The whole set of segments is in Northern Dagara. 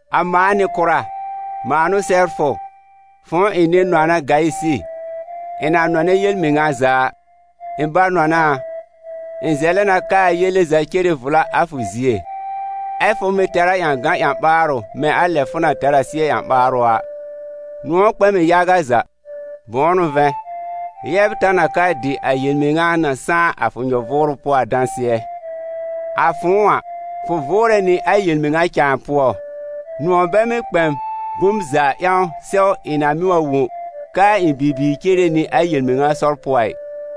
A mãa Nɩ-kʋra, mãa n'ʋ sɛbr fʋ, fʋ̃ʋ ɩ̃ nɩ-nɔna Gayisɩ, ɩ̃ na nɔnɛ yel-mɩŋa za a. Ɩ̃ ba-nɔna a, ɩ̃ zɛlɛ na k'aa yele za cere vla a fʋ zie, ɛ́ fʋ mɩ̀ tɛr a ƴãgan ƴã-ɓaarʋ mɛ̃ a lɛ fʋ na tɛr a sɩ́ɛ ƴã-ɓaarʋ a. Nʋ̃ɔ̀ kpɛ m ɩ yaga za, bʋ̃ʋ n'ʋ vɛ̃, yɛbr ta n a ka dɩ a yel-mɩŋa na sãá a fʋ nyɔ-vʋʋrʋ pʋɔ a dãsɩɛ: a fʋ̃ʋ a, fʋ vʋʋrɛ nɩ a yel-mɩŋa cãa pʋɔ. Nʋ̃ɔ̀ bɛ mɩ́ kpɛ m bom za ƴãw sɛw ɩ̃ na mɩ́ wa wõ k'aa ɩ̃ bibiir cere nɩ a yel-mɩŋa sɔr pʋɔ a ɩ.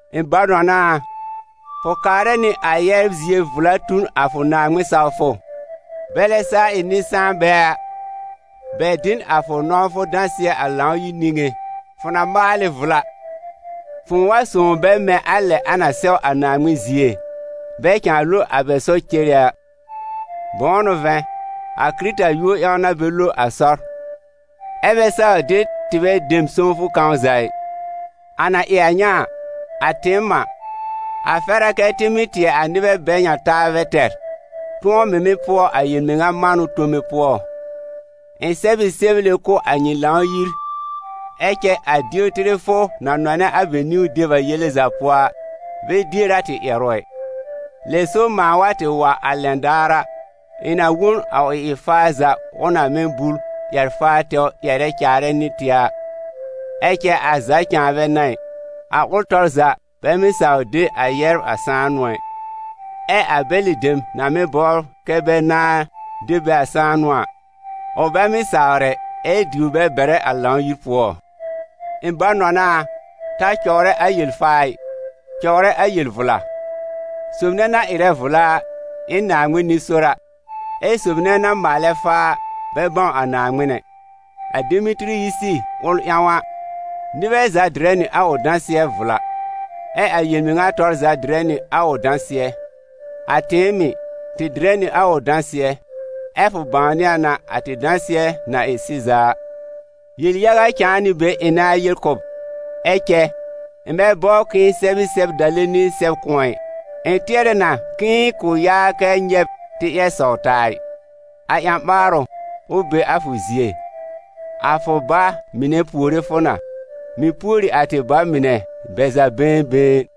Ɩ̃ ba-nɔna a, fʋ kaarɛ nɩ a yɛbr zie vla tu n a fʋ Naaŋmɩn-sawfʋ, bɛlɛ saa ɩ nɩ-sãanbɛ a. Bɛ dɩ n a fʋ nɔ̃wfʋ dãsɩɛ a Lãw-yir niŋé. Fʋ na maal ɩ vla, fʋ̃ʋ wa sõw bɛ mɛ̃ a lɛ a na sɛw a Naaŋmɩn zie, bɛ cãa lo a bɛ sɔr cere a. Bʋ̃ʋ n'ʋ vɛ̃, a Kɩrɩta yúor ƴãw n'a bɛ lo a sɔr, ɛ́ bɛ saw de tɩbɛ dem sõwfʋ kãw za ɩ. A na ɩ a ŋa a, a tɩɩm a, a fɛr a kɛ́ tɩ mɩ́ tɩɛ a nɩbɛ bɛ ŋa taabɛ tɛr, tʋ̃ɔ mɩ̀ mɩ́ pʋɔ a yel-mɩŋa manʋ tome pʋɔ. Ɩ̃ sɛb ɩ sɛble kʋ̀ a nyɩ Lãw-yir, ɛ cɛ a Diotɩrɛfʋ na nɔnɛ a bɛ niwn deb a yele za pʋɔ a, bɛ dier a tɩ ƴɛrʋ ɛ. Lɛ so mãa wa tɩ wa a lɛn daar a, ɩ̃ na wo n a ʋ ɩ-faar za, ʋl na mɩ́ bul ƴɛr-faar tɛwr ƴɛrɛ caarɛ nɩ tɩ a. Ɛ cɛ a za cãa bɛ n'a ɩ, a ʋl tɔr za bɛ mɩ́ saw de a yɛbr a sãanʋ ɛ, ɛ a bɛlɩ dem na mɩ́ bɔbr kɛ́ bɛ nãá de bɛ a sãanʋ a, ʋ bɛ mɩ́ sawr ɛ, ɛ diwr bɛ bɛrɛ a Lãw-yir pʋɔ. Ɩ̃ ba-nɔna a, ta cɔwrɛ a yel-faa ɩ, cɔwrɛ a yel-vla. Sob nɛ na ɩrɛ vla a, ɩ n Naaŋmɩn nɩ-sora, ɛ sob nɛ na maalɛ faa a, bɛ bãw a Naaŋmɩn ɛ. A Demetɩrɩyisi ʋl ƴãw a, nɩbɛ za dɩrɛ nɩ a ʋ dãsɩɛ vla. Ɛ a yel-mɩŋa tɔr za dɩrɛ nɩ a ʋ dãsɩɛ. A tɩɩm mɩ̀, tɩ dɩrɛ nɩ a ʋ dãsɩɛ, ɛ fʋ bãwnɩ a n'a a tɩ dãsɩɛ na ɩ sɩza a. Yel-yaga cãa nɩ be ɩ̃ nãa yel kʋ̀ b, ɛ cɛ, ɩ̃ bɛ bɔbr k'ɩ̃ɩ sɛb ɩ sɛb-dale nɩ sɛb kʋ̃ɔ ɛ. Ɩ̃ tɩɛrɛ na k'ɩ̃ɩ kʋ̃ yaa kɛ nyɛ̃ b tɩ ƴɛr sɔw taa ɩ. A ƴã-ɓaarʋ, ʋ be a fʋ zie. A fʋ ba mɩnɛ puore fʋ na. Mɩ̀ pùori a tɩ ba mɩnɛ, bɛ za been been.